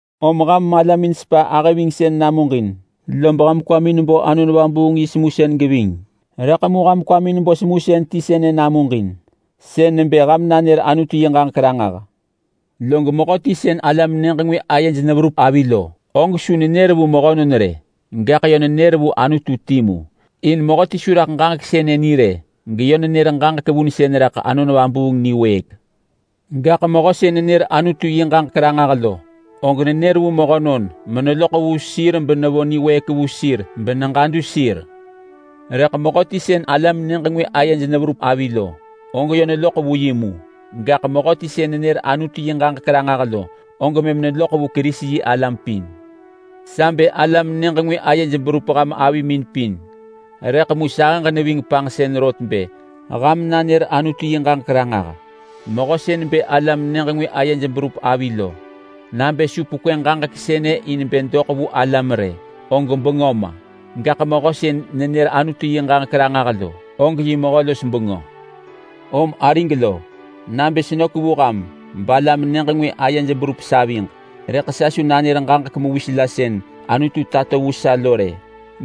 Om ham malamin sepa ahë-vingsën namuġin, lob ham kwamin bo Anon Vabuung yi semusën geving, rëḳ mu ham kwamin bo semusën ti sënë namuġin, sën nebë ham nanër Anutu yi ġaġek ranġah. Log mehöti sën alam-nyëġ-ngwë ayej neverup avi lo, og su nenër vu mehönon rë, gaḳ yö nenër vu Anutu timu. In mehöti su raḳ ġaġek sënë ni rë geyö nenër ġaġek vunsën raḳ Anon Vabuung niwëëk. Gaḳ mehö sën nenër Anutu yi ġaġek ranġah lo, og nenër vu mehönon meneloḳ vu sir benevo niwëëk vu sir beneġadu sir. Rëḳ mehöti sën alam-nyëġ-ngwë ayej neverup avi lo, og yö neloḳ vu yi mu, gaḳ mehöti sën nenër Anutu yi ġaġek ranġah lo, og mëm neloḳ vu Kerisi-yi-alam pin. Sa bë alam-nyëġ-ngwë ayej berup ham avimin pin, rëḳ mu sahëġ neving panġsën rot bë ham nanër Anutu yi ġaġek ranġah. Mehö sën bë alam-nyëġ-ngwë ayej berup avi lo, nabë su pekwë ġaġek sënë in bë doḳ vu alam rë, og bengö ma. Gaḳ mehö sën nenër Anutu yi ġaġek ranġah lo, og yi mehö-los-bengö. Om arig lo, nabë senök vu ham balam-nyëġ-ngwë ayej berup saviġ, rëḳ sa su nanër ġaġek mewis la sën Anutu tato vu sa lo rë,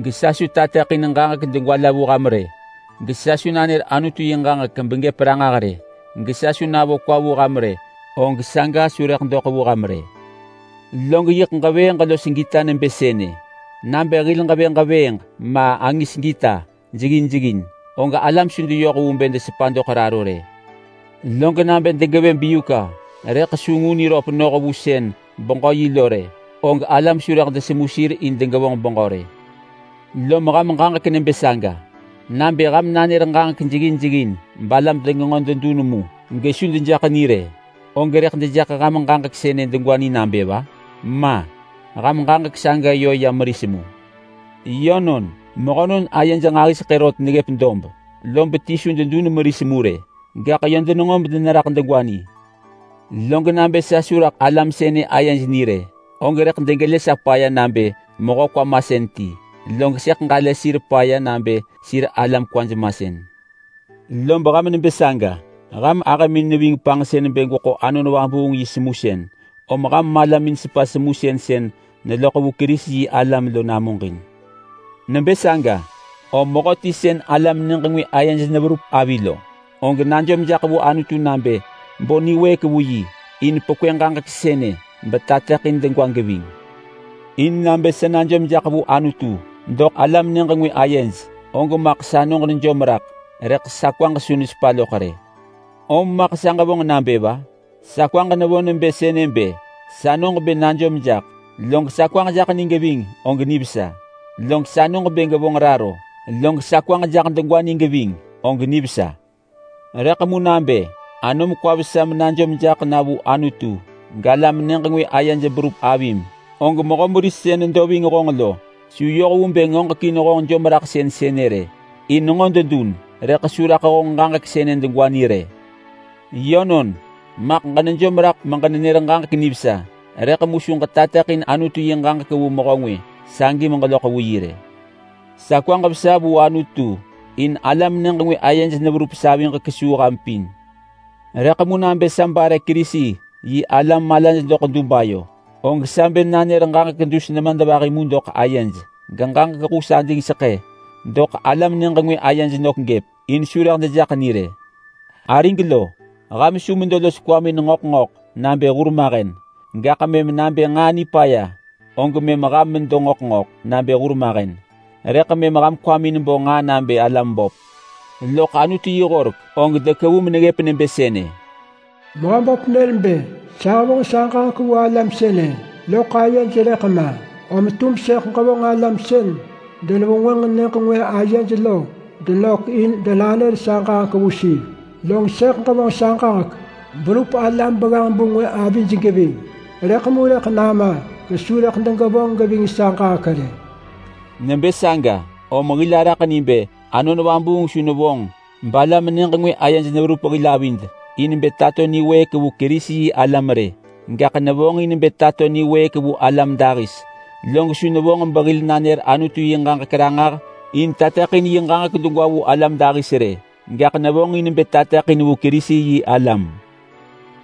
gesa su tateḳin ġaġek degwa la vu ham rë, gesa su nanër Anutu yi ġaġek begëp ranġah rë, gesa su navo kwa vu ham rë, og saga su rëḳ doḳ vu ham rë. Log yiḳ ġevëëġ los gita nebë sënë! Nabë hil ġevë ġevëëġ ma angis gita jeggin jeggin, og alam su deyoh vu bë desepa doḳ raro rë. Log nabë degevë biuka rëḳ su ngu niröp noh vu sën beġö yi lo rë, og alam su rëḳ desemu sir in degevonġ beġö rë. Lom ham ġaġek nebë saga. Nabë ham nanër ġaġek jeggin jeggin balam degenġo dedun mu gesu dejaḳ ni rë, og rëḳ dejaḳ ham ġaġek sënë degwa ni nabë va? Ma! Ham ġaġek saga yö ya meris mu. Yönon, mehönon ayej nġahiseḳë rot neggëp dob, lob ti su dedun meris mu rë. Gaḳ yö denenġo medeneraḳ degwa ni. Log nabë sa su raḳ alam sënë ayej ni rë, og rëḳ degelë sa paya nabë mehö kwa masën ti. Log sëḳ ġalë sir paya nabë sir alam kwaj masën. Lob ham nebë saga. Ham ahëmin neving panġsën bë gweḳo Anon Vabuung yi semusën, om ham malamin sepa semusën sën neloḳ vu Kerisi-yi-alam lo namuġin. Nebë saga, om mehöti sën alam-nyëġ-ngwë ayej neverup avi lo, og najom jaḳ vu Anutu nabë bo niwëëk vu yi in pekwë ġaġek sënë betateḳin degwa geving. In nabë sa najom jaḳ vu Anutu doḳ alam-nyëġ-ngwë ayej, og maḳ sanoġ nejom raḳ, rëḳ sa kwaġ su nesepa loḳ rë. Om maḳ sa ġevonġ nabë va? Sa kwaġ nevo nebë sënë bë: Sanoġ bë najom jaḳ, log sa kwaġ jaḳ ni geving, og nivesa. Log sanoġ bë gevonġ raro, log sa kwaġ jaḳ degwa ni geving, og nivesa. Rëḳ mu nabë anom kwa vesa menajom jaḳ na vu Anutu galam-nyëġ-ngwë ayej berup avim, og mehö meris sën nedo ving honġ lo su yoh vu bë ngoġekin honġ jomraḳsën sënë rë. In nenġo dedun rëḳ su raḳ honġ ġaġek sënë degwa ni rë. Yönon, maḳ ġenejom raḳ meġenenër ġaġek nivesa, rëḳ mu su ġetateḳin Anutu yi ġaġek vu mehö ngwë sagi meġeloḳ vu yi rë. Sa kwaġ vesa vu Anutu in alam-nyëġ-ngwë ayej neverup saviġ kesuu ham pin. Rëḳ mu nabë sa bare Kerisi-yi-alam malaj doḳ dub ayo, og sa bë nanër ġaġek dus nemadvahi mu doḳ ayej geġaġek hus adingseḳë doḳ alam-nyëġ-ngwë ayej nök gëp, in su rëḳ dejaḳ ni rë. Arig lo, ham su medo los kwamin ngöḳ ngöḳ nabë hurmahen. Gaḳ mëm nabë nġaa nipaya, og mëm ham medo ngöḳ ngöḳ nabë hurmahen. Rëḳ mëm ham kwamin bo nġaa nabë alam böp. Loḳ Anutu yi horek, og dekevu meneggëp nebë sënë: “Mehöböp nër bë, ‘Sa hevonġ sa ġaġek vu alam sënë loḳ ayej rëḳ ma, om tum sëḳ ġevonġ alam sën denevengwënġ nyëġ ngwë ayej lo denök in bë denanër sa ġaġek vu sir. Log sëḳ ġevonġ sa ġaġek berup alam begganġ-bu ngwë avij geving, rëḳ mu rëḳ nama gesu rëḳ degevonġ geving sa ġaġek rë.’” Nebë saga om hil araḳ ni bë Anon Vabuung su nevonġ balam-nyëġ-ngwë ayej neverup hil avid in bë tato niwëëk vu Kerisi-yi-alam rë, gaḳ nevonġ in bë tato niwëëk vu alam dahis. Log su nevonġ behil nanër Anutu yi ġaġek ranġah in tateḳin yi ġaġek degwa vu alam dahis rë, gaḳ nevonġ in bë tateḳin vu Kerisi-yi-alam.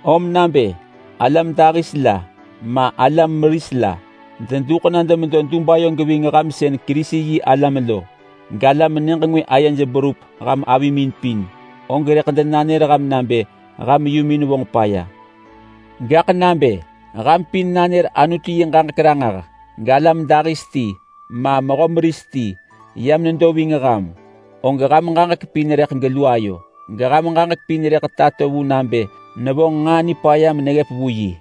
Om nabë alam dahis la ma alam meris la deduḳ na demedo dub ayo geving ham sën Kerisi-yi-alam lo galam-nyëġ-ngwë ayej berup ham avimin pin, og rëḳ denanër ham nabë ham yumin vonġ paya. Gaḳ nabë ham pin nanër Anutu yi ġaġek ranġah, galam dahis ti ma mehö meris ti yam nedo ving ham, og ham ġaġek pin rëḳ gelu ayo geham ġaġek pin rëḳ tato vu nabë nevonġ nġaa nipaya meneggëp vu yi.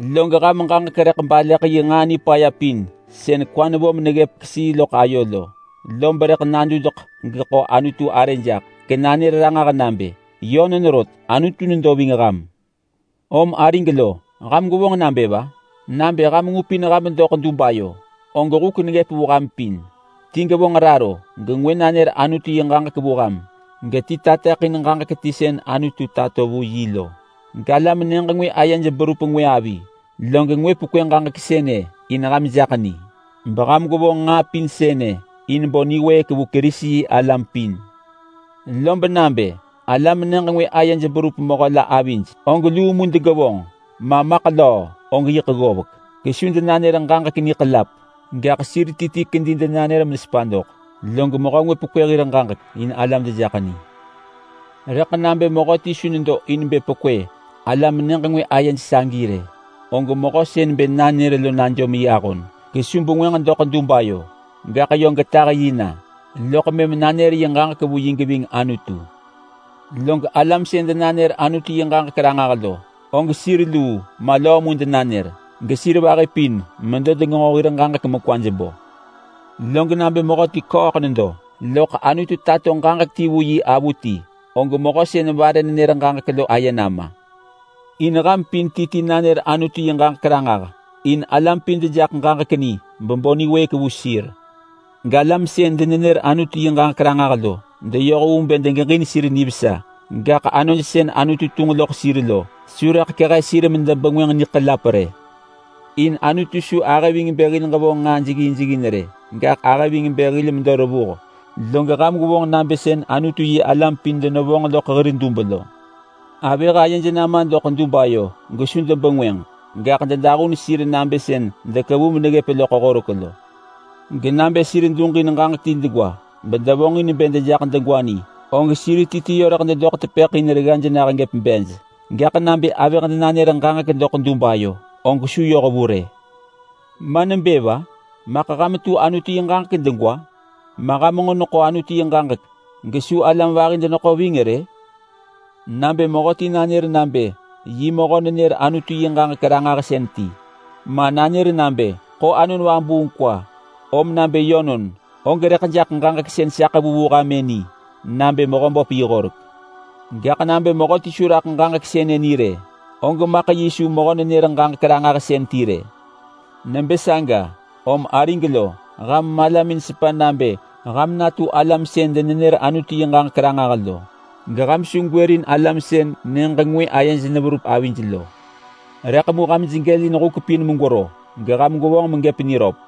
Log ham ġaġek rëḳ baleḳ yi nġaa nipaya pin sën kwa nevo meneggëp kesii loḳ ayo lo, lob rëḳ nadudeḳ gegeḳo Anutu arë jaḳ genanër ranġah nabë, “Yönon rot, Anutu nedo ving ham!” Om arig lo, ham gwevonġ nabë va? Nabë ham ngupin ham doḳ dub ayo, og huk neggëp vu ham pin. Ti gevonġ raro, gengwë nanër Anutu yi ġaġek vu ham, geti tateḳin ġaġek ti sën Anutu tato vu yi lo, galam-nyëġ-ngwë ayej berup ngwë avi, log ngwë pekwë ġaġek sënë in ham jaḳ ni, beham gwevonġ nġaa pin sënë in bo niwëëk vu Kerisi-yi-alam pin. Lob nabë alam-nyëġ-ngwë ayej berup mehö la avij, og luu mu degevonġ, ma maḳ löö, og yiḳ ggovek. Gesu denanër ġaġek niḳelap, gaḳ sir ti ti kedi denanër mesepa doḳ, log mehö ngwë pekwë hir ġaġek in alam dejaḳ ni. Rëḳ nabë mehöti su nedo in bë pekwë alam-nyëġ-ngwë ayej sagi rë, og mehö sën bë nanër lo najom yi ahon gesu bengwënġ doḳ dub ayo. Gaḳ yö getah yi na loḳ mëm nanër yi ġaġek vu yi geving Anutu. Log alam sën denanër Anutu yi ġaġek ranġah lo, og sir luu ma löö mu denanër, gesir vahi pin medo degenġo hir ġaġek mekwaj bo. Log nabë mehöti ḳööḳ nedo, loḳ Anutu tato ġaġek ti vu yi avuti, og mehö sën vare nenër ġaġek lo aye nama. In ham pin ti ti nanër Anutu yi ġaġek ranġah in alam pin dejaḳ ġaġek ni bebo niwëëk vu sir. Galam sën denenër Anutu yi ġaġek ranġah lo deyoh vu bë degeġin sir nivesa, gaḳ anoj sën Anutu tunġ loḳ sir lo su rëḳ kehe sir medebengwënġ niḳelap rë. In Anutu su ahë ving bë hil ġevonġ nġaa jeggin jeggin rë, gaḳ ahë ving bë hil medo revuh. Log ham gwevonġ nabë sën Anutu-yi-alam pin denevonġ loḳ hir dub lo. Avëh ayej nama doḳ dub ayo gesu debengwënġ. Gaḳ dedahun sir nabë sën dekevu meneggëp loḳ Horek lo. Genabë sir duġin ġaġek ti degwa bedevonġin bë dejaḳ ni, og sir ti ti yö rëḳ dedoḳ tepëḳ in reggaj gëp bej. Gaḳ nabë avëh denanër ġaġek doḳ dub ayo og su yoh vu rë. Ma nebë va? Maḳ ham tu Anutu yi ġaġek degwa? Ma ham nġo neḳo Anutu yi ġaġek gesu alam vahi deneḳo ving rë? Nabë mehöti nanër nabë yi mehö-nenër-Anutu-yi-ġaġek-ranġahsën ti ma, nanër nabë ḳo Anon Vabuung kwa, om nabë yönon, og rëḳ jaḳ ġaġek sën sa ḳevu vu ham-ë ni nabë Mehöböp yi horek. Gaḳ nabë mehöti su raḳ ġaġek sënë ni rë, og maḳ yi su mehö-nenër-ġaġek-ranġahsën ti rë. Nebë saga om arig lo, ham malamin sepa nabë ham natu alam sën denenër Anutu yi ġaġek ranġah lo, geham su gwërin alam sën nyëġ ngwë ayej neverup avij lo. Rëḳ mu ham jegelin huk pin megwero geham gwevonġ megëp niröp.